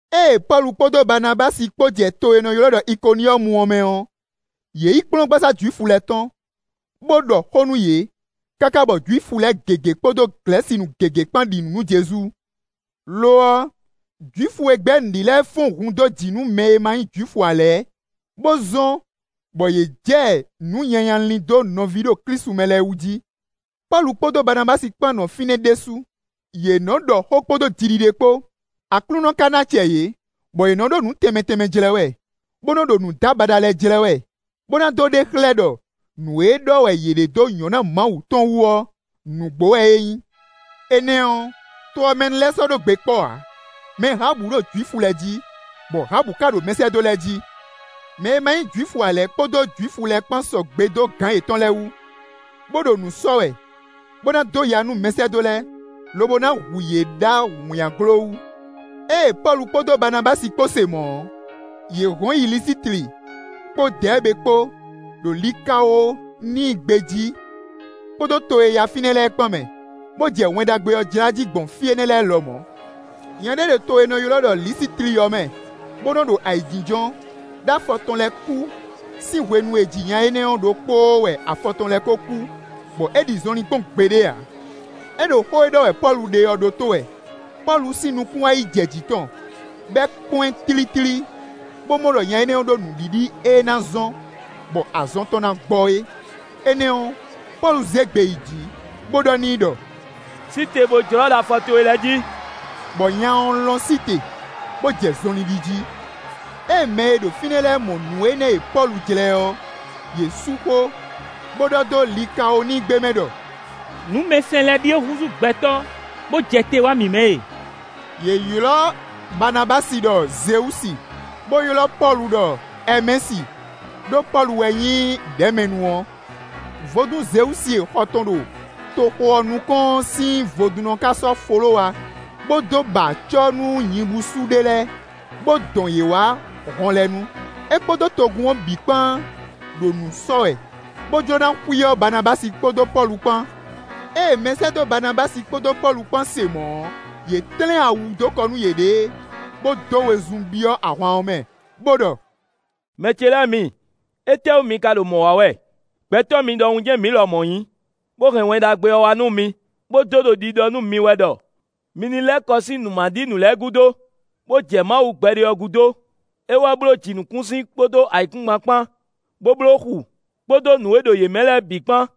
Ée Pɔ́lu kpódó Baanabási kpó jɛ to e è nɔ ylɔ́ ɖɔ Ikoniyɔ́mu ɔ́ mɛ ɔ́, yě yi kplɔ́ngbasá Jwifu lɛ́ɛ tɔn, bó ɖɔ xó nú yě, káká bɔ Jwifu lɛ́ɛ gěgé kpódó Glɛ̌sinu gěgé kpán ɖi nǔ nú Jezu. Lo ɔ́, Jwifu e gbɛ́ nǔ ɖi lɛ́ɛ fɔ́n hun dó jǐ nú mɛ e ma nyí Jwifu ǎ lɛ́ɛ, bó zɔ́n bɔ yě jɛ nǔ nyanya lin dó nɔví ɖo Klísu mɛ lɛ́ɛ wú jí. Pɔ́lu kpódó Baanabási kpán nɔ fínɛ́ ɖésú. Yě nɔ ɖɔ xó kpódó jiɖiɖe kpó. Aklúnɔ ká ná acɛ yě, bɔ yě nɔ́ ɖo nǔ tɛnmɛ tɛnmɛ jlɛ́ wɛ, bó nɔ́ ɖo nǔdábaɖa lɛ́ɛ jlɛ́ wɛ, bó ná dó ɖe xlɛ́ ɖɔ nǔ e ɖɔ wɛ yě ɖe dó nyɔ̌ná Mawu tɔn wú ɔ́ nǔgbó wɛ é nyí. Énɛ́ ɔ́, to ɔ́ mɛ nu lɛ́ɛ sɔ́ ɖó gbe kpɔ́ ǎ; mɛ hǎbǔ ɖo Jwifu lɛ́ɛ jí, bɔ hǎbǔ ká ɖo mɛsɛ́dó lɛ́ɛ jí. Mɛ e ma nyí Jwifu ǎ lɛ́ɛ kpódó Jwifu lɛ́ɛ kpán sɔgbe dó gǎn yětɔn lɛ́ɛ wú, bó ɖo nǔ sɔ́ wɛ, bó ná dó ya nú mɛsɛ́dó lɛ́ɛ, lobo ná hu yě ɖó awǐnnyaglo wú. Ée Pɔ́lu kpódó Baanabási kpó se mɔ̌ ɔ́, yě hɔn yi Lisitli kpó Dɛɛbe kpó, ɖo Likawoníi gbé jí kpódó to e yá fínɛ́ lɛ́ɛ kpán mɛ, bó jɛ Wɛn Ɖagbe ɔ́ jlá jí gbɔn fí énɛ́ lɛ́ɛ lɔmɔ̌. Nya ɖé ɖo to e è nɔ ylɔ́ ɖɔ Lisitli ɔ́ mɛ, bó nɔ́ ɖo ayǐjínjɔ́n, ɖó afɔ tɔn lɛ́ɛ kú; sín hwenu e è ji nya énɛ́ ɔ́ ɖokpóó wɛ afɔ tɔn lɛ́ɛ ko kú, bɔ é ɖi zɔnlin kpɔ́n gbeɖé ǎ. É ɖo xó e ɖɔ wɛ Pɔ́lu ɖe ɔ́ ɖótó wɛ. Pɔ́lu sín nukún wá yi jɛ jǐ tɔn, bɔ é kpɔ́n ɛ tlítlí, bó mɔ ɖɔ nya énɛ́ ɖó nǔɖiɖi e ná zɔ́n bɔ azɔn tɔn ná gbɔ é. Énɛ́ ɔ́, Pɔ́lu zé gbe yi jǐ, bó ɖɔ n'i ɖɔ: “Sí te bó jlɔ́ ɖo afɔ towe lɛ́ɛ jí.” Bɔ nya ɔ́ lɔ́n sí te, bó jɛ zɔnlin ɖi jí. Ée mɛ e ɖo fínɛ́ lɛ́ɛ mɔ nǔ énɛ́ e Pɔ́lu jlɛ́ ɔ́, yě sú xó, bó ɖɔ dó Likawoníi gbe mɛ ɖɔ: “Nǔmɛsɛn lɛ́ɛ ɖíe húzú gbɛtɔ́ bó jɛ te wá mǐ mɛ e.” Yě ylɔ́ Baanabási ɖɔ Zewúsi, bó ylɔ́ Pɔ́lu ɖɔ Ɛɛmɛsi; ɖó Pɔ́lu wɛ nyí ɖɛ̌mɛnu ɔ́. Vodún Zewúsi e xɔ tɔn ɖo toxo ɔ́ nukɔn ɔ́ sín vodúnnɔ ka sɔ́ folówa bó dó ba acɔ́ nú nyibúsú ɖé lɛ́ɛ, bó dɔn yě wá hɔn lɛ́ɛ nu. É kpódó togun ɔ́ bǐ kpán ɖo nǔ sɔ́ wɛ, bó jló ná xwíyɔ Baanabási kpódó Pɔ́lu kpán. Ée mɛsɛ́dó Baanabási kpódó Pɔ́lu kpán se mɔ̌ ɔ́, yě tlɛ́n awu dó kɔ nú yěɖée, bó dó wezun byɔ́ ahwan ɔ́ mɛ, bó ɖɔ: “Mɛ ce lɛ́ɛ mi, étɛ́wú mi ka ɖo mɔ̌ wa wɛ? Gbɛtɔ́ mi ɖɔhun jɛ́n mǐ lɔmɔ̌ nyí, bó hɛn Wɛn Ɖagbe ɔ́ wá nú mi, bó dó ɖo ɖiɖɔ nú mi wɛ ɖɔ mi ní lɛ́ kɔ sín nǔ ma ɖi nǔ lɛ́ɛ gúdo, bó jɛ Mawu gbɛɖe ɔ́ gúdo; é wɛ bló jǐnukúnsin kpódó ayǐkúngban kpán, bó bló xu, kpódó nǔ e ɖo yě mɛ lɛ́ɛ bǐ kpán.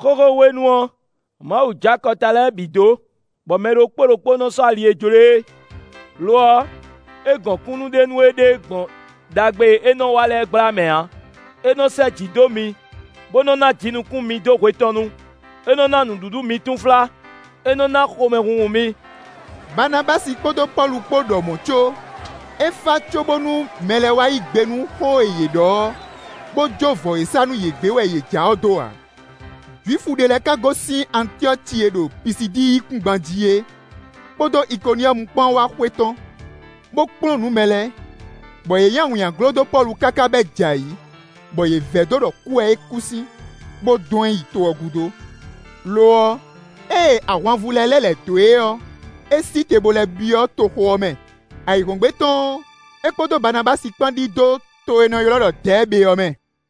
Xóxó hwenu ɔ́, Mawu jó akɔta lɛ́ɛ bǐ dó, bɔ mɛ ɖokpó ɖokpó nɔ sɔ́ ali e jló e é. Lo ɔ́, é gɔn kúnnu ɖe nú éɖée gbɔn ɖagbe e é nɔ wa lɛ́ɛ gbla mɛ ǎ. É nɔ sɛ́ jǐ dó mi, bó nɔ́ ná jinukún mi dó hwe tɔn nu. É nɔ ná nǔɖuɖu mi túnflá; é nɔ ná xomɛhunhun mi.” Baanabási kpódó Pɔ́lu kpó ɖɔ mɔ̌ có, é fá cóbónú mɛ lɛ́ɛ wá yí gbe nú xó e yě ɖɔ ɔ́, bó jó vɔ̌ e sá nú yě gbé wɛ yě ja ɔ́ dó ǎ. Jwifu ɖé lɛ́ɛ ka gosín Antyɔ́ci e ɖo Pisidíi yíkúngban jí é kpódó Ikoniyɔ́mu kpán wá xwetɔ́n, bó kplɔ́n nǔ mɛ lɛ́ɛ, bɔ yě nyi awǐnnyaglo dó Pɔ́lu káká bɔ é jɛ ayǐ, bɔ yě vɛdó ɖɔ é kú wɛ sín, bó dɔn ɛ yi to ɔ́ gúdo. Lo ɔ́, ée ahwanvú lɛ́ɛ lɛ́ lɛ̌ dó e ɔ́, é sí te bo lɛ́ byɔ́ toxo ɔ́ mɛ. Ayǐhɔ́ngbe tɔn ɔ́, é kpódó Baanabási kpán ɖidó to e è nɔ ylɔ́ ɖɔ Dɛɛbe ɔ́ mɛ.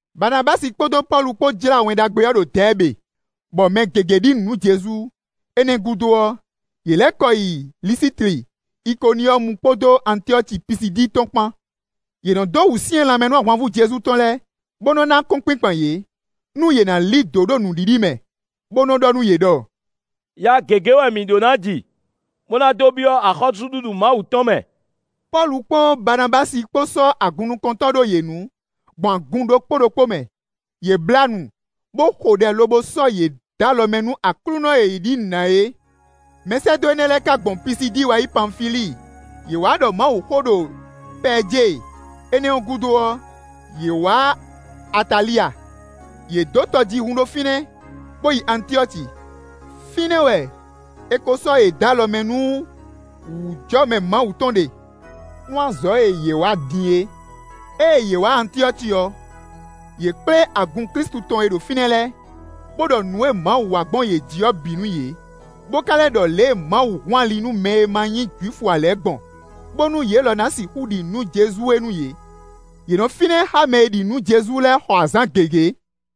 Baanabási kpódó Pɔ́lu kpó jlá Wɛn Ɖagbe ɔ́ ɖo Dɛɛbe, bɔ mɛ gěgé ɖi nǔ nú Jezu. Énɛ́ ɔ́ gúdo ɔ́, yě lɛ́ kɔ yi Lisitli, Ikoniyɔ́mu kpódó Antyɔ́ci Pisidíi tɔn kpán. Yě nɔ dó wǔsyɛ́n lanmɛ nú ahwanvú Jezu tɔn lɛ́ɛ, bó nɔ́ ná akɔ́nkpinkpan yě, nú yě ná lí dǒ ɖo nǔɖiɖi mɛ, bó nɔ́ ɖɔ nú yě ɖɔ: “Ya gěgé wɛ mǐ ɖó nǎ ji, bó ná dó byɔ́ axɔ́súɖuɖu Mawu tɔn mɛ.” Pɔ́lu kpó Baanabási kpó sɔ́ agunnukɔntɔ́ ɖó yě nu, gbɔn agun ɖokpó ɖokpó mɛ. Yě blá nu, bó xo ɖɛ lobo sɔ́ yě dó alɔ mɛ nú Aklúnɔ e yě ɖi nǔ na é. Mɛsɛ́dó énɛ́ lɛ́ɛ ka gbɔn Pisidíi wá Panfilíi. Yě wá ɖɔ Mawuxó ɖo Pɛɛjée; énɛ́ ɔ́ gúdo ɔ́, yě wǎ Atalya. Yě dó tɔjíhún ɖo fínɛ́, bó yi Antyɔ́ci; fínɛ́ wɛ è ko sɔ́ yě dó alɔ mɛ nú wǔjɔmɛ Mawu tɔn ɖe, nú azɔ̌ e yě wa din é. Ée yě wá Antyɔ́ci ɔ́, yě kplé agun Klísu tɔn e ɖo fínɛ́ lɛ́ɛ, bó ɖɔ nǔ e Mawu wa gbɔn yě jí ɔ́ bǐ nú yě, bó ka lɛ́ ɖɔ lě e Mawu hun ali nú mɛ e ma nyí Jwifu ǎ lɛ́ɛ gbɔn, bónú yě lɔ na sixú ɖi nǔ nú Jezu é nú yě. Yě nɔ fínɛ́ xá mɛ e ɖi nǔ nú Jezu lɛ́ɛ xɔ azǎn gěgé.